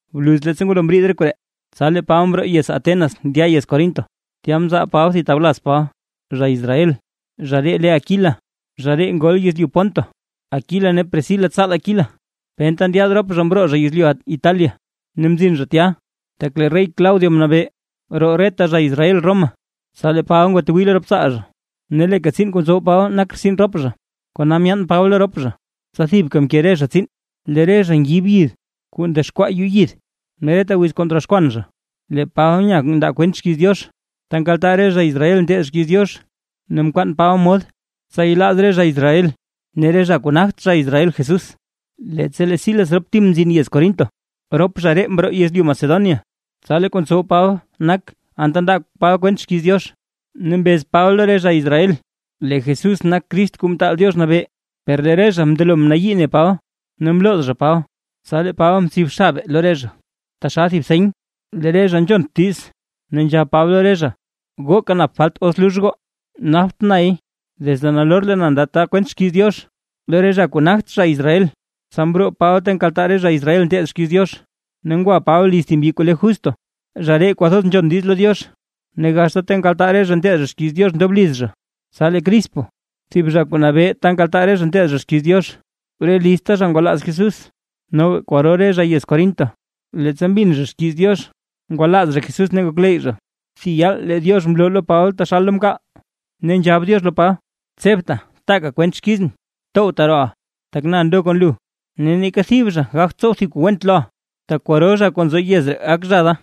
Bluz leettsa ngwalo mriid re koree, tsa lee Paba mroo yez Atenas ndya yez Corinto. Tya mzaal Paba thib tawlaz Paba, zha Israel, zha ree le Aquila, zha ree ngol yezlyu Ponto. Aquila ne Priscila tsaal Aquila penta ndyaad rop zha mroo zha yezlyu Italia ne mzin zha tya, tak lee rey Claudio mnabee roo reta zha Israel Roma. Tsa lee Paba ngwatwii lo rop tsaal zha. Ne leeka tsiin kuu ntsow Paba nak rtsin rop zha. Kona myaan Paba lo rop zha, tsa thibka mke re zha tsiin, lee re zha ngib yid kuu ndexkwaa yuu yid. Ne reta wiz kuu ndroxkwan zha, lee Paba nya ndaa kwent xkiiz Diox ta nkaltaa re zha Israel nteed xkiiz Diox, ne mkwaan Paba mod tsa yelaaz re zha Israel ne re zha kuu nagt zha Israel Jesús. Leettsa lee Silas rop Tim mzin yez Corinto, rop zha ree mroo yezlyu Macedonia. Tsa lee kuu ntsow Paba nak anta ndaa Paba kwent xkiiz Diox, ne mbez Paba lo re zha Israel lee Jesús nak Crist Kuu Mtaal Diox Nabee. Per lee re zha mndelo mnayii mne Paba, ne mlooz zha Paba. Tsa lee Paba mtsib xabe lo re zha, taxal thib seny lee re zha nzhont diiz, ne nzhab Paba lo re zha: ―Gooka nap falt os lux goo, napt nay. Desde nalor leen ndata kwent xkiiz Diox lo re zha kuu nagt zha Israel. Tsa mroo Paba ta nkaltaa re zha Israel nteed xkiiz Diox, ne ngwa Paba liz thib mbyi kuu le Justo, zha ree kwathoz nzhon diiz lo Diox. Ne gaxta ta nkaltaa re zha nteed xkiiz Diox ndob liz zha. Tsa lee Crispo thib zha kuu nabee ta nkaltaa re zha nteed zha xkiiz Diox, re lizta zha ngwalaaz Jesús, noga kwaro re zha yez Corinto leettsa mbin zha xkiiz Diox ngwalaaz zha Jesús ne ngokleyy zha. Thib yaal lee Diox mloo lo Paba taxal lo mkaal, ne nzhab Diox lo Paba: ―Tsebta, taaka kwent xkizʼn. Towta rooʼa, tak na ndo kon lu, ne neeka thib zha gagt tsow thib kuu went loʼa, tak kwaro zha kuu nzo yez ree gak zha da.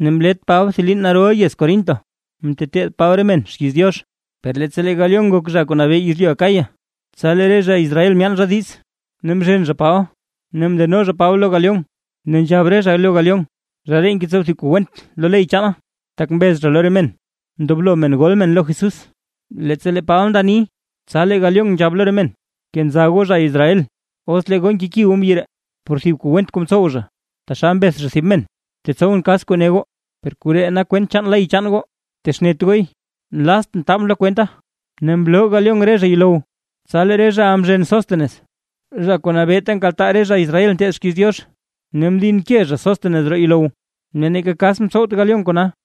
Ne mlet Paba thib liin narol yez Corinto, mteteed Paba re men xkiiz Diox. Per leettsa lee Galión nak zha kuu nabee yezlyu Acaya, tsa lee re zha Israel myaan zha diiz ne mzhen zha Paba ne mndeno zha Paba lo Galión, ne nzhab re zha lo Galión: ―Zha ree ngetsow thib kuu went lo ley chaanaa: Tak mbez zha lo re men, ndoblo men gol men lo Jesús. Leettsa lee Paba nda ni, tsa lee Galión nzhab lo re men: ―Kenza goo zha Israel, os lee goo nkeki goo mbyi ree por thib kuu went kuu mtsow zha, taxal mbeth zha thib men, tetsowʼn kas kuu ne goo. Per koree nak kwent chaan ley chaan goo, btexnet gooy, nlaaztʼn taabʼn lo kwenta. Ne mloo Galión re zha yuulow. Tsa lee re zhaʼa mzhen Sostenés zha kuu nabee ta nkaltaa re zha Israel nteed xkiiz Diox, ne mdinke zha Sostenés roo yuulow, ne neeka kas mtsowt Galión kona.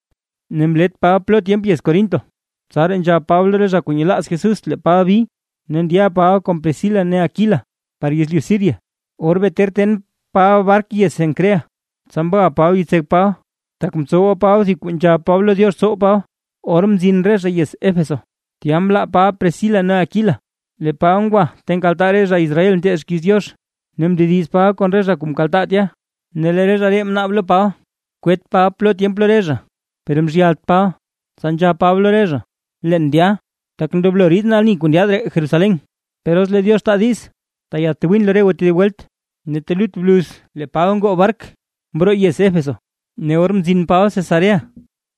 Ne mlet Paba plo tyemp yez Corinto, tsaraa nzhab Paba lo re zha kuu nyelaaz Jesús lee Paba bi, ne ndya Paba kon Priscila ne Aquila par yezlyu Siria. Or bee ter ten Paba bark yez Cencrea, tsa mga Paba yitsek Paba, tak mtsowa Paba thib kuu nzhab Paba lo Diox tsow Paba. Or mzin re zha yez Éfeso, tya mlaa Paba Priscila ne Aquila, lee Paba ngwa ta nkaltaa re zha Israel nteed xkiiz Diox, ne mndediz Paba kon re zha kuu mkaltaa tya, ne lee re zha ree mnaab lo Paba kwet Paba plo tyemp lo re zha, per mzhyalt Paba. Tsa nzhab Paba lo re zha: ―Leen ndya, tak ndoblo riidʼn ani kuu ndyaad ree Jerusalén. Per os lee Diox taa diiz tayadtwin lo re goo tedib welt. Ne telut bluz lee Paba ngoo bark mroo yez Éfeso. Ne or mzin Paba Cesarea,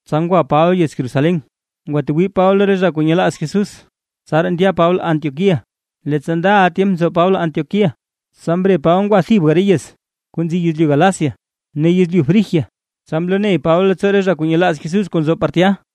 tsa ngwa Paba yez Jerusalén, ngwatwii Paba lo re zha kuu nyelaaz Jesús, tsaraa ndya Paba Antioquía. Leettsa ndaʼa tyemp nzo Paba Antioquía, tsa mre Paba ngwa thibga re yez kuu nzi yezlyu Galacia ne yezlyu Frigia, tsa mloney Paba leettsoo re zha kuu nyelaaz Jesús kuu nzo par tya.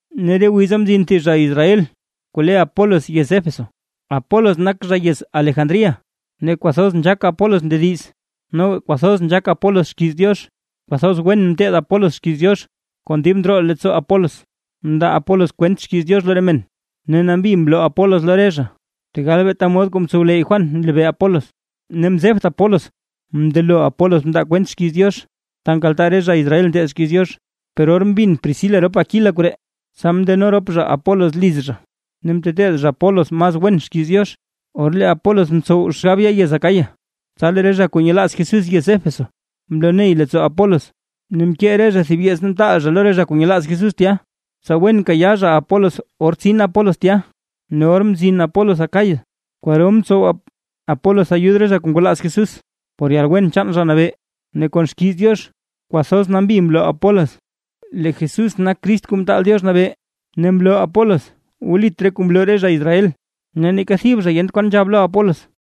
Ne re wiza mzin thib zha Israel kuu le Apolos yez Éfeso, Apolos nak zha yez Alejandría. Ne kwathoz nzhaak Apolos ndediz, noga kwathoz nzhaak Apolos xkiiz Diox. Kwathoz wen mteed Apolos xkiiz Diox, kon dib ndroo leettsoo Apolos mndaa Apolos kwent xkiiz Diox lo re men ne nambi mloo Apolos lo re zha, tegal beeta mod kuu mtsowleyy Juan nlebee Apolos. Ne mzebt Apolos mndelo Apolos mndaa kwent xkiiz Diox, ta nkaltaa re zha Israel nteed xkiiz Diox, per or mbin Priscila rop Aquila koree, tsa mndeno rop zha Apolos liz zha ne mteteed zha Apolos mas wen xkiiz Diox. Or lee Apolos mtsow xgab ya yez Acaya, tsa lee re zha kuu nyelaaz Jesús yez Éfeso, mloney leettsoo Apolos ne mkee re zha thib yeets mtaal zha lo re zha kuu nyelaaz Jesús tya, tsa wen kayaa zha Apolos or tsin Apolos tya. Ne or mzin Apolos Acaya kwaro mtsow Apolos ayud re zha kuu ngwalaaz Jesús por yalwen chaan Zha Nabee, ne kon xkiiz Diox kwathoz nambi mloo Apolos, lee Jesús nak Crist Kuu Mtaal Diox Nabee, ne mloo Apolos wlit re kuu mloo re zha Israel. Ne neeka thib zha yent kwan nzhab lo Apolos.